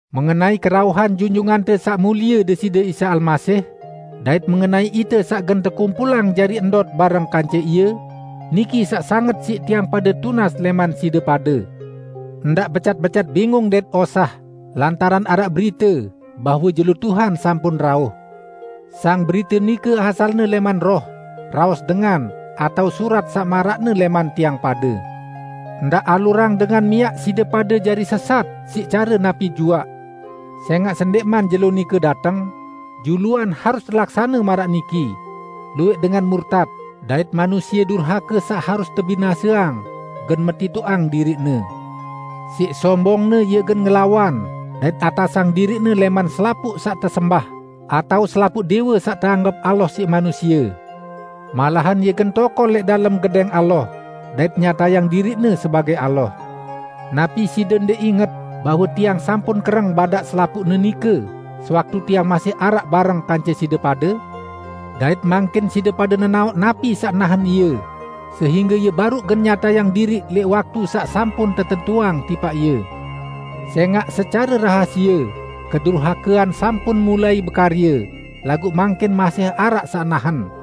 Mengenai kerauhan Junjungante Saq Mulie Deside Isa Almasih, dait mengenai ite saq gen tekumpulang jari ndot bareng kance Ie, niki saq sanget siq tiang pade tunas lẽman side pade: Ndaq becat-becat bingung dait osah lantaran araq berite bahwe jelo Tuhan sampun rauh. Sang berite nike asalne lẽman roh, raos dengan, atao surat saq maraqne lẽman tiang pade. Ndaq alurang dengan miaq side pade jari sesat siq care napi juaq. Sẽngaq sendẽqman Jelo nike dateng, juluan harus telaksane maraq niki: Luwẽq dengan murtat, dait manusie durhake saq harus tebinaseang gen metitoqang diriqne. Siq sombongne ie gen ngelawan dait atasang diriqne lẽman selapuq saq tesembah atao selapuq dẽwe saq teanggep Allah siq manusie. Malahan ie gen tokol lẽq dalem Gedẽng Allah, dait nyatayang diriqne sebagẽ Allah. Napi side ndẽq inget bahwe tiang sampun kereng badaq selapuqne nike sewaktu tiang masih araq bareng kance side pade? Dait mangkin side pade nenaoq napi saq nahen ie, sehingge ie baruq gen nyatayang diriq lẽq waktu saq sampun tetentuang tipaq ie. Sẽngaq secare rahasie kedurhakean sampun mulai bekarye, laguq mangkin masih araq saq nahen.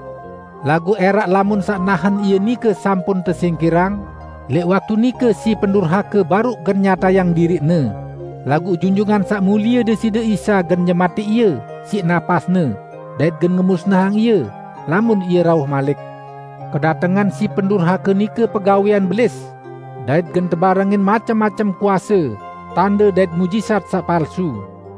Laguq ẽraq lamun saq nahen ie nike sampun tesingkirang, lẽq waktu nike si pendurhake baruq gen nyatayang diriqne, laguq Junjungan Saq Mulie Deside Isa gen nyematẽq ie siq napas-Ne dait gen ngemusnahang ie, lamun Ie rauh malik. Kedatengan si pendurhake nike pegawẽan Belis, dait gen tebarengin macem-macem kuase, tande dait muqjizat saq palsu.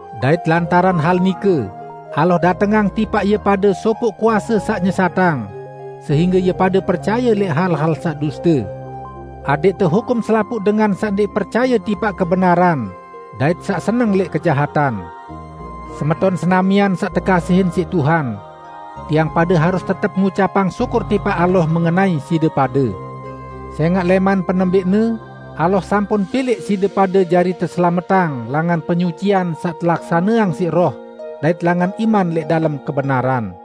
Dait lantaran hal nike Allah datengang tipaq ie pade sopoq kuase saq nyesatang, sehingge ie pade percaye lẽq hal-hal saq duste, adẽq tehukum selapuq dengan saq ndẽq percaye tipaq kebenaran dait saq seneng lẽq kejahatan. Semeton senamian saq tekasihin siq Tuhan! Tiang pade harus tetep ngucapang syukur tipaq Allah mengenai side pade. Sẽngaq lẽman penembẽqne Allah sampun pilẽq side pade jari teselametang langan penyucian saq telaksaneang siq Roh dait langan iman lẽq dalem kebenaran.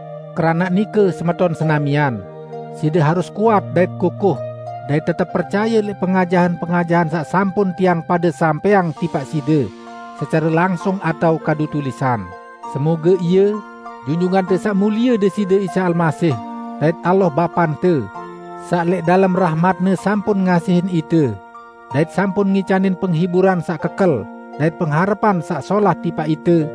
Keranaq nike, semeton senamian, side harus kuat dait kukuh dait tetep percaye lẽq pengajahan-pengajahan saq sampun tiang pade sampẽang tipaq side, secare langsung atao kadu tulisan. Moge-moge, Junjungante Saq Mulie Deside Isa Almasih, dait Allah, Bapante, saq lẽq dalem rahmat-Ne sampun ngasihin ite dait sampun ngicanin penghiburan saq kekel dait pengharepan saq solah tipaq ite,